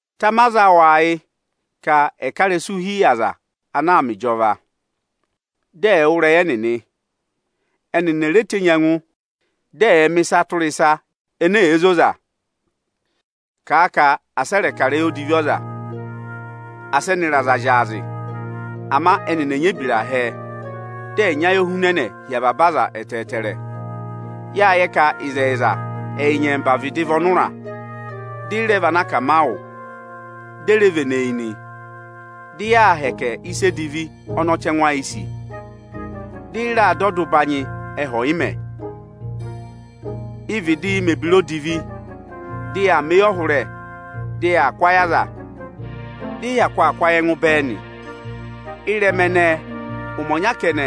Tama aza awụ ayị ka ẹ̀ ká ịrẹsụ hi yị aza anaa mẹ ịjọva, dị ẹ̀ẹ wụ́ ịrẹyị ẹnịnị. Ẹnịnị è re tenyi ẹngụ dị ẹ̀ẹ mẹ̀ ịsa tụra ịsa ene èe zoza. Kàa ka asị ẹ rẹ̀ kà ịrẹyị odivi ọza, asị ẹnịrị aza zyaazị! Ama ẹnịnị ẹ̀ nyị ebira hẹẹ, dị ẹ̀ nyị ayohunẹnẹ hi avaba aza ẹtẹẹtẹrẹ! Yáa yẹ ka ẹyị nyẹmba vịdị vị ọnụra, dị ị rẹ vị anakamawụ, di e reè vene yi nị. Dị yaa hẹkẹ ịsa edivi ọnị ọchẹngụ ayịị̄ sì, dị ị rẹ dụ ọda ụbanyị ẹhẹ ọnọnị ọyịmẹ̀ nị. Ịị̄ vịdịị mẹ̀ ebira edivi, dị yaa mẹ eyọhụrẹ, dị yaa kụ́ ayị aza, dị ị hyakụ aa kụ́ ayị ẹngụ bẹẹ nị. Ịrẹma ẹnẹẹ, ụmẹ ọnya kẹnẹ,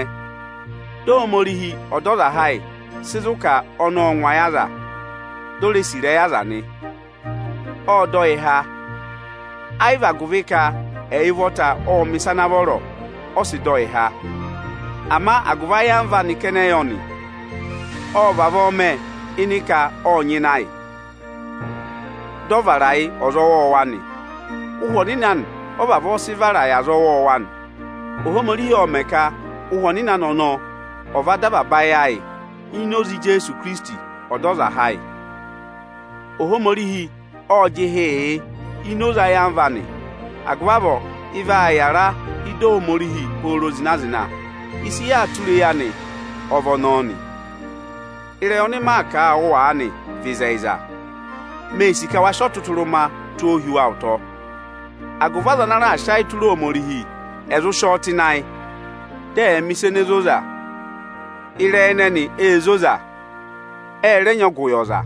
dị Ohomorihi Ọdọzaha ayị sị zụ̀ ka ọnị ọ́ọ ngụ ayị aza, dị o re sì ịrẹyị aza nị. Ộ dọ yị há. Ẹ́ yị vị agụvị ka ẹyị ụvọta ọ́ọ mẹ̀ ịsa ana vọrọ, ọ sị dọ yị há, ama agụvị ayamva anị kẹnẹ yọ nị. Ộ vavọọ mẹ ịnị ka ộ nyịna yị, dị ọ vara yị ọza ọwọọwa nị. Ụhwẹ Ọnịnị anị ọ vavọọ sị vara yị aza ọwọọwa nị. Ohomorihi ộ mẹ̀ ka Ụhwẹ Ọnịnị anị ọnọọ ọ̀ va dọ avaba ayị ayị ini oze Ijeesu Ikirisiti Ọdọzaha ayị. Ohomorihi ộ jịhịị yị ini oze ayamva anị, agụvị avọọ ị vaa yara ị́dị Ohomorihi pooro zịna-zịna. Ịsị yaa tụra eyi anị ọ vị ọnọọ nị. Ịrẹyị ọnị maa kà a wụ aanị vị ịzẹyịza. Mee sì ka wa sị ọtụtụrụma tụ́ ọ hi wa ụtọ, agụvị aza ana raà sị ayị tụra Ohomorihi, ẹ̀ zụ sị ọ tụ́ ịnị ayị, dị ẹ̀ mẹ̀ ịsa ene zoza. Ịrẹyị ẹnẹnị ée zoza, ẹ rẹ nyị ọgụ yị ọza.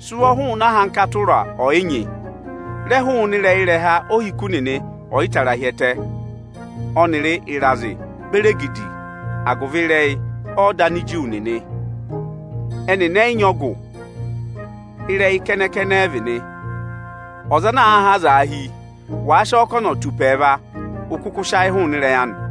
Sị ụvọ hụụnị ahankata ụra ọ̀yị nyị. Rẹ hụụnị ịrẹha ohiku ọ̀yị tara hi ẹtẹ, ọnịrị ịrazị beri egidi agụvị ịrẹyị ọda Aniju nị! Ẹ́ yị nyị ọgụ, ịrẹyị kẹnẹ-kẹnẹ ẹ vị nị. Ọza ana àaa há azaa hi, wàa sị ọ kà ọ̀nọ̀ tù ụpẹ ẹẹva, ụ kụkụ sị ayị hụụnị ịrẹyị anị!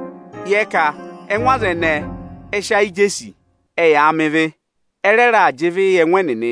Yẹ ka ẹngụ aza ẹnẹẹ ẹ́ sị ayị jesi, ẹyaa mẹ ịvị, ẹ rẹ raà jị ịvị yị ẹngụ ẹnịnị.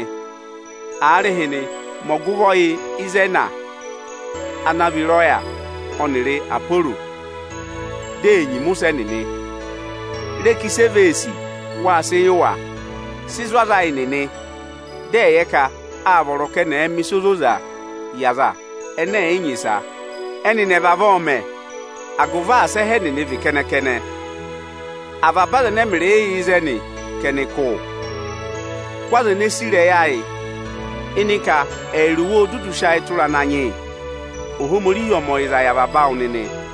Ịkọ 16.12Aarịhịnị, mẹ ọgụvọ yị Ịzẹẹna ana vị ịrọya, ọnịrị Aporo, dị è nyima ụsẹ ẹnịnị. Re ka ịsị èe vee sì, wáa sị yị wa. Sị zụ̀ aza ayị nịnị, dị ẹ̀ yẹ ka aa vọrọ ka ẹnị ẹ̀ ẹ mẹ̀ ịsa ozozaa yị aza ẹnẹ ẹ̀ yị nyị ịsa. Ẹnịnị ẹ̀ vavọọ mẹ, agụvị asị ẹhẹ ẹnịnị vị kẹnẹ-kẹnẹ. Avaba aza ẹnẹ ẹmịrịị yà ịzẹnị ka ẹnị kụ́ wụ. Kụ́ aza ene sì ịrẹyị ayị ịnị ka ẹyịrị wa óo dudu sị ayị tụra Ananyị yị. Ohomorihi ọ̀ mẹ ọyịza yị avaba awụ nịnị o!